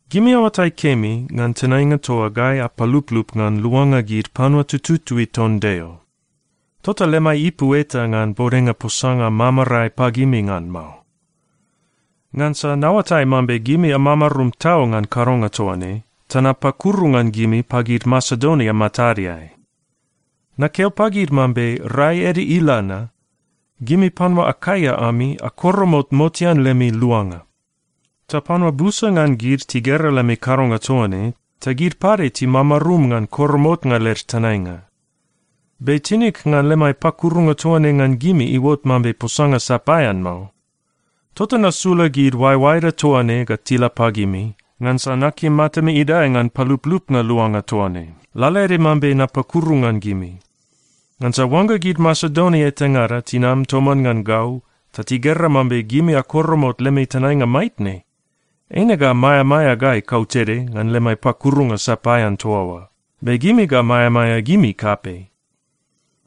Gimi aoatai kemi ngan tenainga toa gai apaluplup ngan luanga gid panua tututui ton Deo. Tota lemai ipu eta ngan bodenga posanga mamarae pagimi ngan mao. Ngansa naoatai mambe gimi amamarum tau ngan kadonga toa ne, ta napakuru ngan gimi pagid Masedonia matadeai. Nakeo pagid mambe rai ede ila na, gimi panua Akaia ami akoromot motean lemi luanga. Ta panua busa ngan gid tigera lemi kadonga toa ne ta gid pade timamarum ngan koromotnga led tenainga. Be tinig ngan lemai pakurunga toa ne ngan gimi iuot mambe posanga sapaean mao. Tota nasula gid oaeoaeda toa ne ga tila pagimi, ngansa nakim matami idae ngan paluplupnga luanga toa ne, lalaede mambe napakuru ngan gimi. Ngansa oangga gid Masedonia etangada tinam toman ngan gau ta tigera mambe gimi akoromot lemi tenainga maitne, eine ga maeamaea gai kautede ngan lemai pakurunga sapaean toa oa. Be gimi ga maeamaea gimi kapei.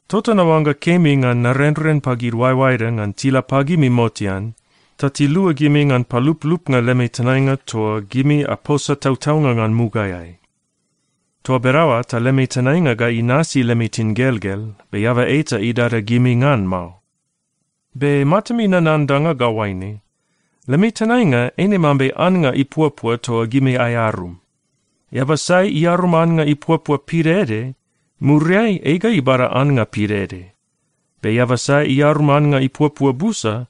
Tota naoangga kemi ngan narenren pagid oaeoaeda ngan tila pagimi motean, ta tilua gimi ngan paluplupnga lemi tenainga toa gimi aposa tautaunga ngan mugaeai. Toa bedaoa ta lemi tenainga ga inasi lemi tingelgel, be eaba eta idada gimi ngan mao. Be matami nanan danga ga oaine: Lemi tenainga eine mambe annga ipuapua toa gimi aearum. Eaba sai iarum annga ipuapua pidaede, muriai ei ga ibada annga pidaede. Be eaba sai iarum annga ipuapua busa,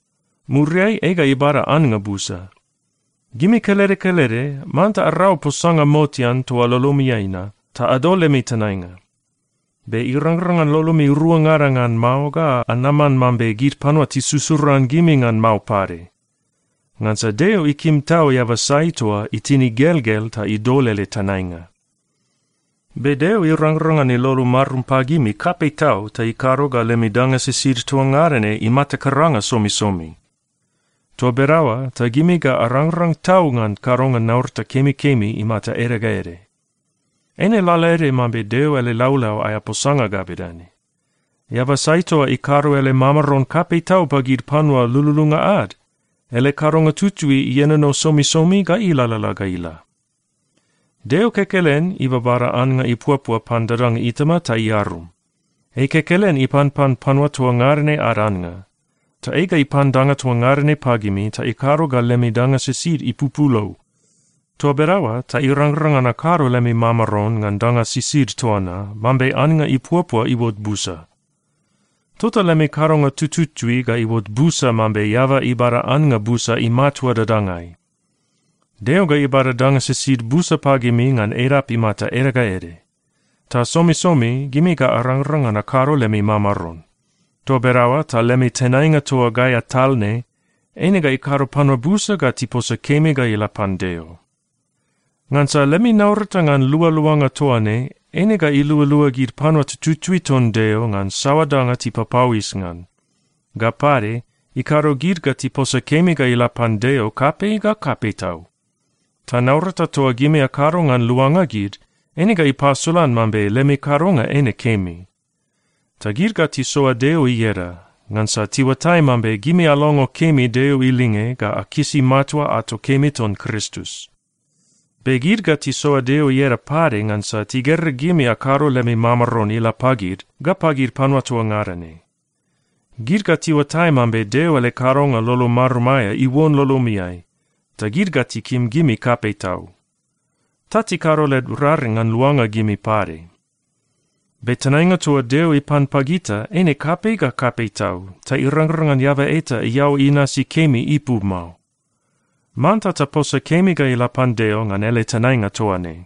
muriai ei ga ibada annga busa. Gimi kelede kelede manta arau posanga motean toa lolomiai na, ta adol lemi tenainga. Be irangrang ngan lolomi ruangada ngan mao ga anaman mambe gid panua tisusuran gimi ngan mao pade. Ngansa Deo ikim tau eaba sai toa itin igelgel ta idol ele tenainga. Be Deo irangrang ngan ilolo marum pagimi kapei tau ta ikado ga lemi danga sisid toa ngada ne imata karanga somisomi. Toa bedaoa ta gimi ga arangrang tau ngan kadonga naurata kemikemi imata ede ga ede. Eine lalaede mambe Deo ele laulau aea posanga ga bedane, “Eaba sai toa ikado ele mamaron kapei tau pagid panua lululunga ad, ele kadonga tutui ienono somisomi ga ilalala ga ila.” Deo kekelen ibabada annga ipuapua pan dadanga itama ta iarum. Ei kekelen ipanpan panua toa ngada ne ad annga. Ta ei ga ipan danga toa ngada ne pagimi ta ikado ga lemi danga sisid ipupulou. Toa bedaoa ta irangrang ngan akado lemi mamaron ngan danga sisid toa na, mambe annga ipuapua iuot busa. Tota lemi kadonga tututui ga iuot busa mambe eaba ibada annga busa imatua dadangai. Deo ga ibada danga sisid busa pagimi ngan edap imata ede ga ede. Ta somisomi gimi ga arangrang ngan akado lemi mamaron. Toa bedaoa ta lemi tenainga toa gai atal ne, eine ga ikado panua busa ga tiposa kemi ga ila pan Deo. Ngansa lemi naurata ngan lualuanga toa ne eine ilualua gid panua tututui ton Deo ngan saoa danga tipapauis ngan. Ga pade, ikado gid ga tiposa kemi ga ila pan Deo kapei ga kapei tau. Ta naurata toa gimi akado ngan luanga gid, eine ga ipasolan mambe lemi kadonga eine kemi. Ta gid ga tisoa Deo ieda, ngansa tiuatai mambe gimi alongo kemi Deo ilinge ga akisi matua ato kemi ton Kristus. Be gid ga tisoa Deo ieda pade ngansa tigera gimi akado lemi mamaron ila pagid, ga pagid panua toa ngada ne. Gid ga tiuatai mambe Deo ele kadonga lolo marum aea iuon lolomiai, ta gid ga tikim gimi kapei tau. Ta tikado led raring ngan luanga gimi pade. Be tenainga toa Deo ipan pagita eine kapei ga kapei tau, ta irangrang ngan eaba eta iaoa inasi kemi ipu mao. Manta taposa kemi ga ila pan Deo ngan ele tenainga toa ne.